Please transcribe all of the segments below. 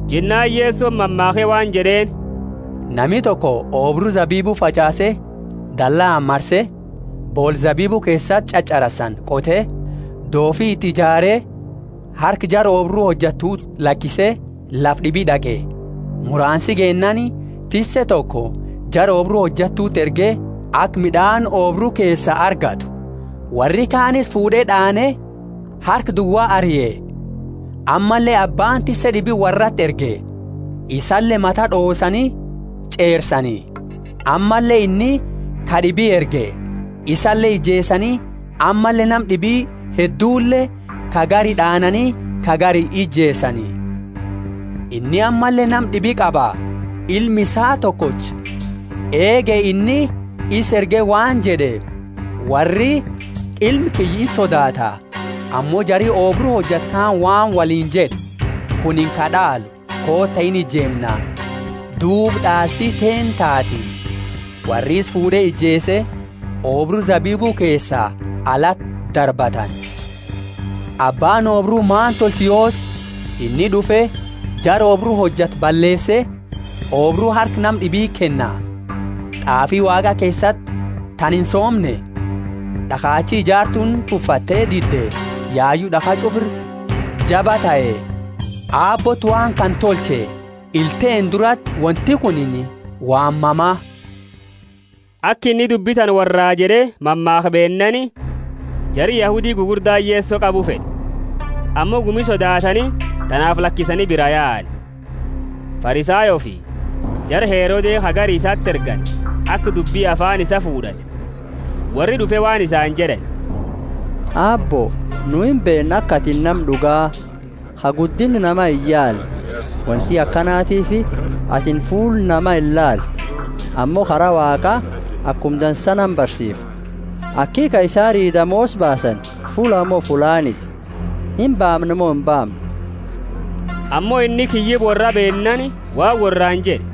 Jennaani Yesoni mammaakhe waan jed'eeni, Nami toko oobru zabibu fach'aase, dallaani marse, boola zabibu keesati ch'ach'arasani qote, doofi iti ijaare, harka jara oobru hojatuti lakise, lafa d'ibi d'aqe. Muraansi geennaani, tisse toko jara oobru hojattuti erge, aka mid'aani oobru keesaa argattu. Worri kaani isa fuud'e d'aane, harka duwa arie. Ammalle abbaani tisse d'ibi worrati erge. Isale mata d'oosani ch'eersani. Ammalle inni ka d'ibi erge, isale ijeesani, ammalle nama d'ibi heddule, ka gari d'aanani, ka gari ijeesani. Inni ammalle nama d'ibi qaba, ilma isaa tokocha. Eege, inni isa erge waan jed'e, Worri ilma kiyya insodaata. Ammo jari oobru hojatu kaani waan woliini jed'e, Kunini ka d'aalu, koota inijeemna, duuba d'aalti teenna taati. Worri isa fuud'e ijeese, oobru zabibu keesaa alati darbatani. Abbaani oobru maani tolcha yoosi? Inni d'ufe, jara oobru hojatu balleese, oobru harka nama d'ibiti kenna. T'aafi Waaqa keesati tana insoomne? D'akhachi ijaartuuni tuffatte dide yayu d'akha ch'ufa ira jaba tahe. Aabbooti waan kana tolche ila teenna durati wonti kuni waan mama! Aka inni dubbi tana worraa jed'e, mammaakhe beennaani, jari Yahudi gugurdaani Yeso qabu fed'e. Ammo gumi sodaatani, tanaafi lakisani biraa yaani. Farisayoofi jara Herode ka gari isati ergani aka dubbi afaani isaa fuud'ani. Worri d'ufe waan isaani jed'ani, Aabbo, nu imbeenna aka atini nama d'uga, ka guddinna nama iyaalle; wonti akanatiifi atini fuula nama inilaaltu, ammo kara Waaqa akuma dansa nama barsiifta. Aki Kaisari damoosa baasani fullaa mo fullaaniti? Imbaamna mo imbaamnu? Ammo inni kiyyiba worraa beennaani, waan worraani jed'e,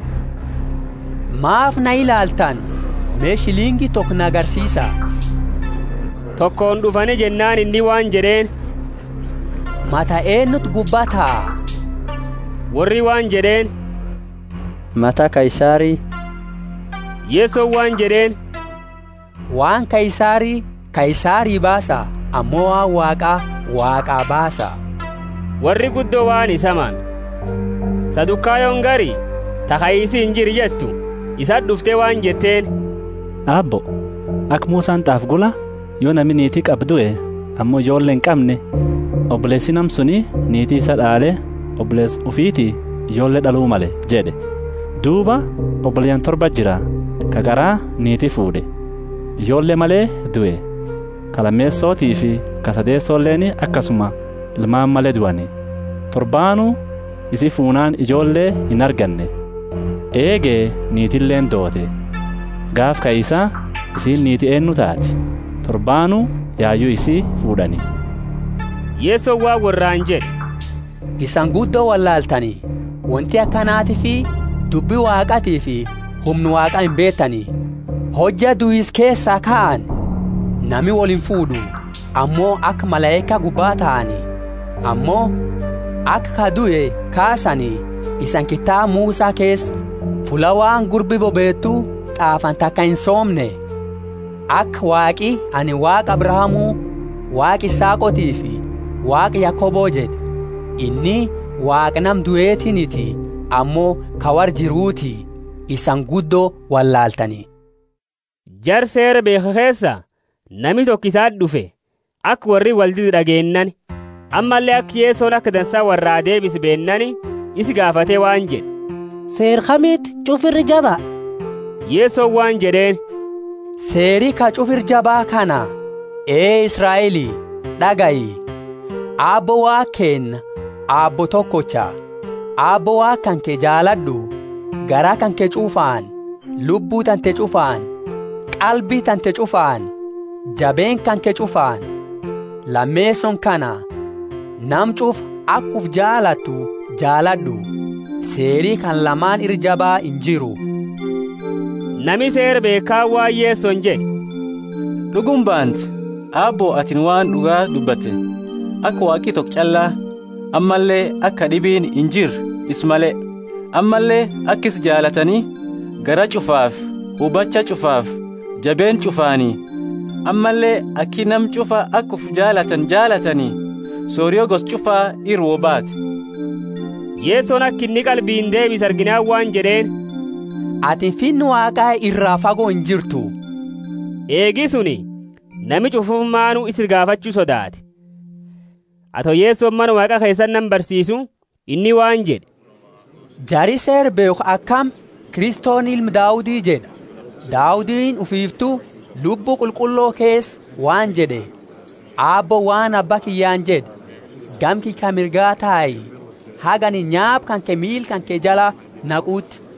Maafi na ilaalattani? Me, shilingi toko na garsiisa. Tokooni d'ufani jennaani inni waan jed'eeni, Mata eenuti gubba taa? Worri waan jed'eeni, Mata Kaisari. Yesoni waan jed'eeni, Waan Kaisari, Kaisarii baasa, ammo waan Waaqa, Waaqaa baasa. Worri guddo waan isaa mame. Sadukayoni gari ta, Kaisi injiru jettu, isati d'ufte waan jetteeni, Aabbo, aka Musani t'aafe gula, yo nami niiti qabu due, ammo ijoolle inqamne, oboleesi nama suni niiti isaa d'aale oboleesa ufiti ijoolle d'alu male jed'e. Duuba, oboleyaani torbati jira; ka qara niiti fuud'e, ijoolle male due. Ka lameesotifi ka sadeesoleeni akasuma ilmaani male duani. Torbaanu isi fuunaani ijoolle inarganne. Eege niitileeni doote. Gaafa kaisa, isiini niiti eennu taati? Torbaani yayu isi fuud'ani. Yesoni waan worraani jed'e, Isani guddo wolaaltani! Wonti akanatiifi dubbi Waaqatiifi humna Waaqa imbeetani. Hojja duisa keesaa kaani, nami wolimfuud'u, ammo aka malaika gubba taani. Ammo aka ka due kaasani isani kitaaba Musa keesa fulla waan gurbi bobeetu t'aafani taka insoomne? Aka Waaqi anini Waaqa Abrahamu, Waaqa Isaaqotiifi Waaqa Yakobo jed'e. Inni Waaqa Nama duetiiniti, ammo ka worra jiruti; isani guddo wolaaltani. Jara Seera beekhu keesa, nami toko isati d'ufe, aka worri woldide d'ageennaani, ammalle aka Yesoni aka dansa worraa deebise beennaani, isa gaafate waan jed'e, Seera kamiti ch'ufa ira jaba? Yesoni waan jed'eeni, Seeri ka ch'ufa ira jaba kana. Ee Israeli, d'agayi, Aabbo Waaqa keenna Aabbo tokocha. Aabbo Waaqa kanke jaalad'u, garaa kanke ch'ufaani, lubbu tante ch'ufaani, qalbi tante ch'ufaani, jabeenna kanke ch'ufaani. Lameesooni kana: nama ch'ufa aka ufi jaalattu jaalad'u. Seeri kana lamaani ira jaba injiru. Nami Seera beekhu kaani waan Yesoni jed'e, D'uguma baanta, Aabbo atini waan d'uga dubbatte, aka Waaqi toko ch'alla, ammalle aka kad'ibiini injirre, isa male; ammalle aki isa jaalatani, garaa ch'ufaafi hubacha ch'ufaafi jabeenna ch'ufaani; ammalle aki nama ch'ufa aka ufi jaalatani jaalatani sorio gosa ch'ufa iraa wo baati. Yesoni aka inni qalbiini deebise arginaani waan jed'eeni. Atini Finna Waaqa iraa fago injirtu. Eegi suni, nami ch'ufumaanu isa gaafachu sodaate. Ato Yesoni Mana Waaqa keesati nama barsiisu, inni waan jed'e, Jari Seera beekhu akami, Kristoni ilma Daudi jed'a? Daudini ufiiftu, Lubbu Qulqullo keesa, waan jed'e: Aabbooni waan Abba kiyyaani jed'e: Gama kiyya ka mirga tai, haga anini nyaapa kanke miila kanke jala naquuti.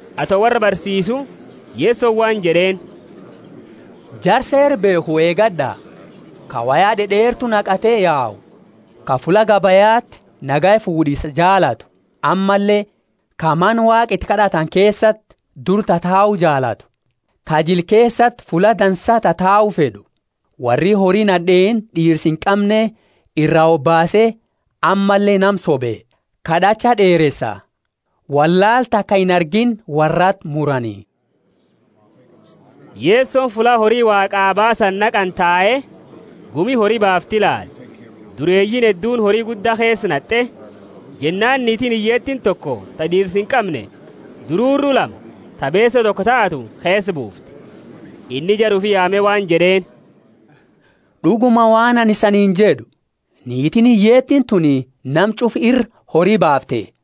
Ato worra barsiisu, Yesoni waan jed'eeni, Jara Seera beekhu eegad'a, ka woya d'ed'eertu naqate yau, ka fulla gabayati nagaya fuud'isa jaalatu ammalle ka Mana Waaqa iti kad'atani keesati dura tatau jaalatu, ka jila keesati fulla dansa tatau fed'u. Worri hori nad'eeni d'iirsa inqamne iraa hobaase, ammalle nama sobe, kad'acha d'eeresa. Wollaala taka inargiini worrati murani. Yesoni fulla hori Waaqaa baasani naqani tae, gumi hori baaftu ilaale. Dureeyiini hedduuni hori gudda keesa nat'e. Jennaani niitiini hiyyeetiini toko, ta d'iirsa inqamne, dururu lama, ta beese toko taatu, keesa buufte. Inni jara ufi yaame waan jed'eeni, D'uguma, waan anini isaniini jed'u, Niitiini hiyyeetiini tuni nama ch'ufa ira hori baafte.